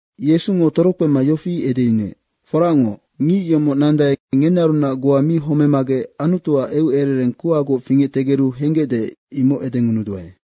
Yesungo torokpema yofi edeyunuec, “Foracngoc, ngic yomoc nandae, ngenearunac goa mi homemagec Anutuac eucerereng kuhagoc fingectegeru henggecde, imoc edengunuduae.”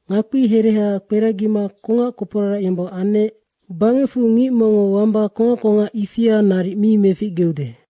Ngakpia hereha kperagima kongac koporarac yombong anec. Bangecfu ngic mongngo wamba kongac kongac ifia naric mi meficgeude.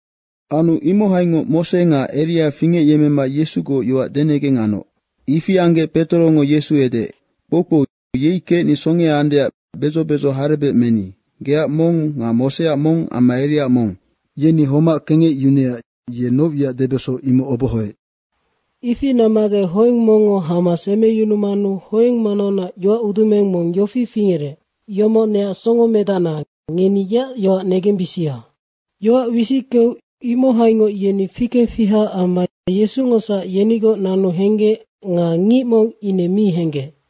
Anu imohaingoc Mose nga Eria fingecyemmema Yesugoc yoac denegeng anoc. Ifi anggec Petorongo Yesu edeec, “Kpoukpou, yei kecni songea andeac bedzo bedzo harebec meni. Geac mong nga Moseac mong amma Eriaac mong.” Yeni homac kengecyunuecac ye noc wiac debeso, imoc obohoec. Ifi nammagec hoeng mongngo hama semeyunumanu hoeng manaunac yoacudumeng mong yofi fingerec, “Yomoc neac Songomedacna, ngeni yeac yoac negembisia!” Yoac wisickeu imohaingoc yeni fikengfiha amma Yesungosac yenigoc nanu henggec nga ngic mong mi henggec.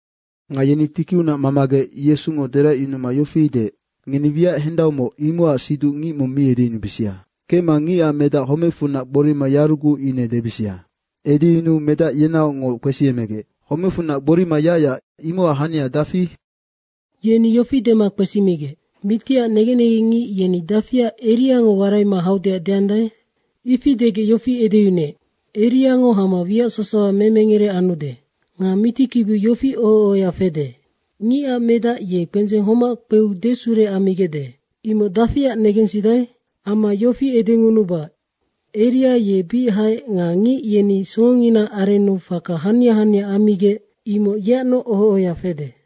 Nga yeni tikiunac mamagec Yesungo deracyunuma yofi deec, “Ngeni wiac hendaumoc, imocac siduc ngic mi edeyunubisia. Kecma Ngicac Medac homecfunac gborima yaruguc ine debisia.” Edeyunuu medac yenaocngoc kpesiemegec, “Homecfunac gborima yacyac, imocac hania dafi?” Yeni yofi dema kpesimigec, “Mitiac negen negengngic yeni dafiac Eriango waraima haudeac deandae?” Ifi degec yofi edeyunuec, “Eriangonoc hama wiac sasawa memengere anude. Nga mitikibiu yofi oho ohoya fede, ‘Ngicac Medac ye kpendzeng homac kpeu desure ammigecde.’ imoc dafiac negensidae?” Amma yofi edengunuba, “Eria ye bic haec nga ngic yeni songonginaac arennu faka hania hania ammigec, imoc yeacnoc oho ohoya fede.”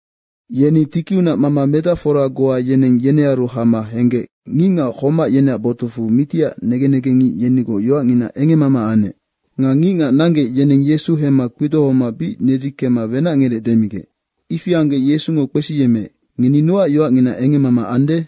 Yeni tikiunac mama medacfora goa yeneng yenearu hama henggec ngicngac homac yeneac botucfu mitiac negen negengngic yenigoc yoacngina engemmama anec. Nga ngicngac nanggec, yeneng Yesu hemma kpidohoma bic nedzikemma wenacngerec demigec. Ifi anggec Yesungo kpesiyemmeec, “Ngeni nocac yoacngina engemmama ande?”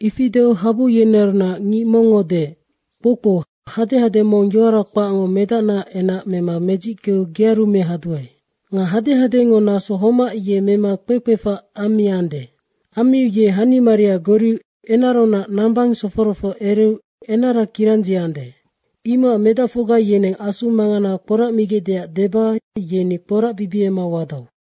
Ifi deu habu yenearunac ngic mongngo deec, “Kpoukpou, hadehade mong yoara kpacngo medacnaac enac mema medzickeu gearu mehaduae. Nga hadehadengo naso homac ye mema kpekpefac ammiande. Ammiu ye hanimaria goriu enaraunac nambang sofororoc ereu enara kirandziande. Imocac medacfocga yeneng asu mangana kporacmigecdeac deba yeni kporacbibiema wadau.”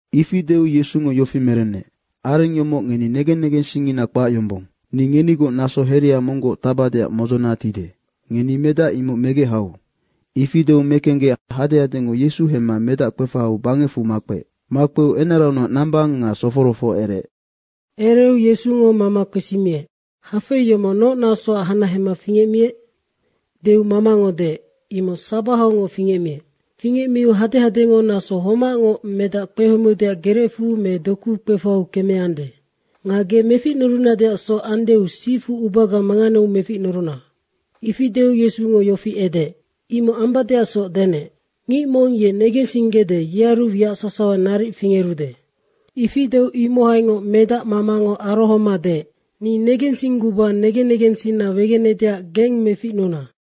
Ifi deu Yesungo yofi merenec, “Areng yomoc ngeni negen negensingngina kpac yombong. Ni ngenigoc naso herea monggoc tacbadeac modzona tide. Ngeni medac imoc megec hau.” Ifi deu mekenggec hadehadengo Yesu hemma medac kpefahau bangecfu makpeec. Makpeu enaraunac nambang nga sofororoc ereec. Ereu Yesungo mama kpesimiec, “Hafei yomoc noc nasoac hanahema fingecmiec?” deu mamango deec, “Imoc sabahaungoc fingecmiec. Fingecmiu hadehadengo naso homacngoc medac kpehomeudeac gerecfu me dokuu kpefahau kemeande. Nga ge meficnurunadeacsoc andeu sifu ubaga manganeu meficnuruna.” Ifi deu Yesungo yofi edeec, “Imoc ambadeacsoc, denec. Ngic mong ye negensinggede, yearu wiac sasawa naric fingerude.” Ifi deu imohaingoc medac mamango arohoma deec, “Ni negensingguba negen negensinna wegenedeac geng meficnuna.”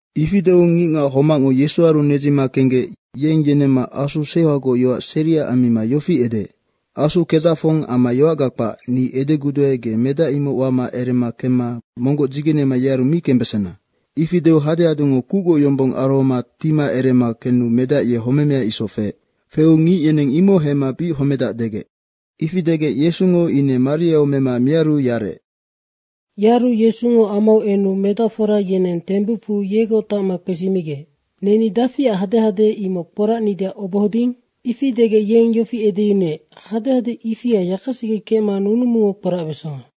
Ifi deu ngicngac homacngo Yesuaru nedzima kenggec yeng yenemma asu seuhagoc yoac seria ammima yofi edeec, “Asu kedzacfong amma yoacga kpac, ni edeguduae, ge medac imoc wama erema kemma monggoc dzigenema yearu mi kembesena.” Ifi deu hadehadengo kucgoc yombong arohoma tima erema kenu medac ye homemea isoc feec. Feu ngic yeneng imoc hemma bic homedac degec. Ifi degec Yesungo ine mariau mema miaru yarec. Yaru Yesungo amau enu medacfora yeneng tembucfu yegoc tacma kpesimigec, “Neni dafiac hadehade imoc kporacnideac obohoding?” Ifi degec yeng yofi edeyunuec, “Hadehade ifia yakasege kecma nunumungo kporacbesonga.”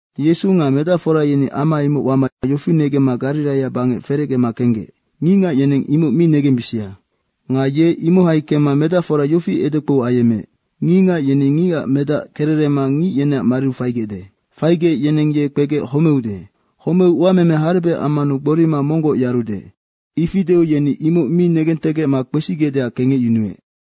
Yesu nga medacfora yeni ama imoc wama yofi negemma Gariraia bangec ferecgema kenggec, “Ngicngac yeneng imoc mi negembisia.” Nga ye imohai kemma medacfora yofi edekpou ayemmeec, “Ngicngac yeni Ngicac Medac kererema ngic yeneac mariu faigecde. Faigec yeneng ye kpegec homeude. Homeu uameme harebec ammanu gborima monggoc yarude.” Ifi deu yeni ine imoc mi negentegecma kpesigecdeac kengecyunuec.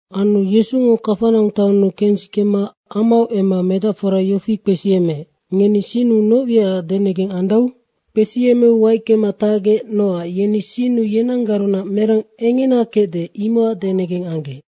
Anu Yesungo Kafanaung taonnu kensikema amau emma medacfora yofi kpesiyemmeec, “Ngeni sinnu noc wiacac denegeng andau?” Kpesiyemmeu waickema tacgec nocac yeni sinnu yenanggarunac merang engena kecde, imocac denegeng anggec.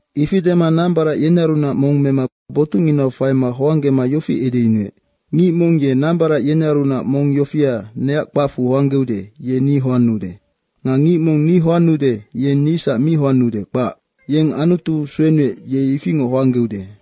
Ifi dema nambarac yenearunac mong mema botucnginau faima hoanggema yofi edeyunuec, “Ngic mong ye nambarac yenearunac mong yofia neac kpacfu hoanggeude, ye ni hoannuude. Nga ngic mong ni hoannude, yeng nisac mi hoannuude, kpac. Yeng Anutu suenuec, ye ifingoc hoanggeude.”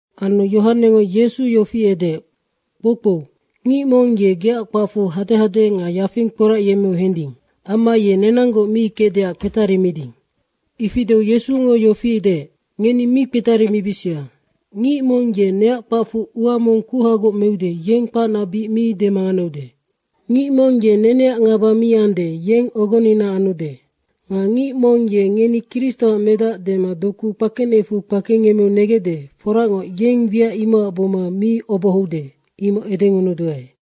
Anu Yohanengo Yesu yofi edeec, “Kpoukpou, ngic mong ye geac kpacfu hadehade nga yafing kporacyemmeu hending. Amma ye nenanggoc mi kecdeac kpetarimiding.” Ifi deu Yesungo yofi deec, “Ngeni mi kpetarimibisia. Ngic mong ye neac kpacfu ua mong kuhagoc meude, yeng kpacna bic mi demanganeude. Ngic mong ye neneac ngaba mi ande, yeng ogonina anude. Nga ngic mong ye ngeni Kristoac medac dema doku kpakenecfu kpengemmeu negecde, foracngoc, yeng wiac imocac buma mi obohoude, imoc edengunuduae.”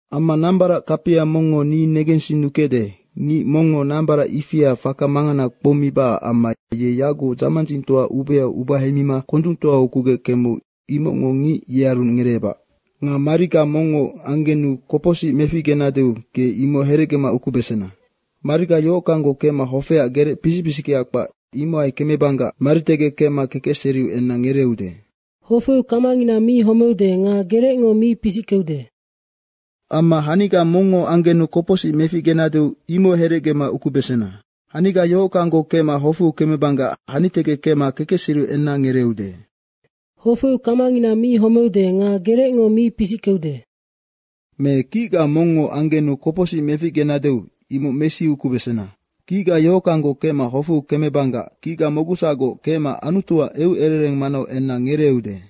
“Amma nambarac kapia mongngo ni negensinnukecde, ngic mongngo nambarac ifia faka mangana kpoumibacac amma ye yagucnoc dzamandzingtoa ubeau ubahemima kondungtoau ukugec kemeu, imocngo ngic yearu ngereebac. Nga mariga mongngo anggenu kopocsic meficgenadeu ge imoc herecgema ukubesena. Mariga yohockanggoc kecma hofeac gerec pisic pisickea kpac, imohai kemebanggac maritegec kecma kekecseriu enna ngereeude. ‘Hofeu kamangina mi homeude nga gerecngo mi pisickeude.’ Amma haniga mongngo anggenu kopocsic meficgenadeu imoc herecge ukubesena. Haniga yohockanggoc kecma hofeu kemebanggac hanitegec kecma kekecseriu enna ngereeude. ‘Hofeu kamangina mi homeude nga gerecngo mi pisickeude.’ Me kicga mongngo anggenu kopocsic meficgenadeu imoc mesiukubesena. Kicga yohockanggoc kecma hofeu kemebanggac kicga mocgusacgoc kecma Anutuac eucerereng manau enna ngereeude.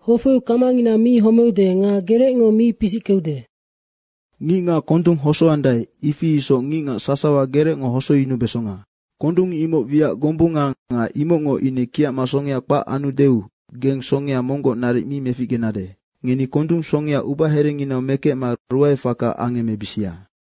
‘Hofeu kamangina mi homeude nga gerecngo mi pisickeude.’ Ngicngac kondung hosoandae, ifi isoc ngicngac sasawa gerecngo hosoyunubesonga. Kondung imoc wiac gombunga nga imocngo ine kiacma songea kpac anudeu geng songea monggoc naric mi meficgenade. Ngeni kondung songea ubaherenginau mekecma ruaefaka angemmebisia.”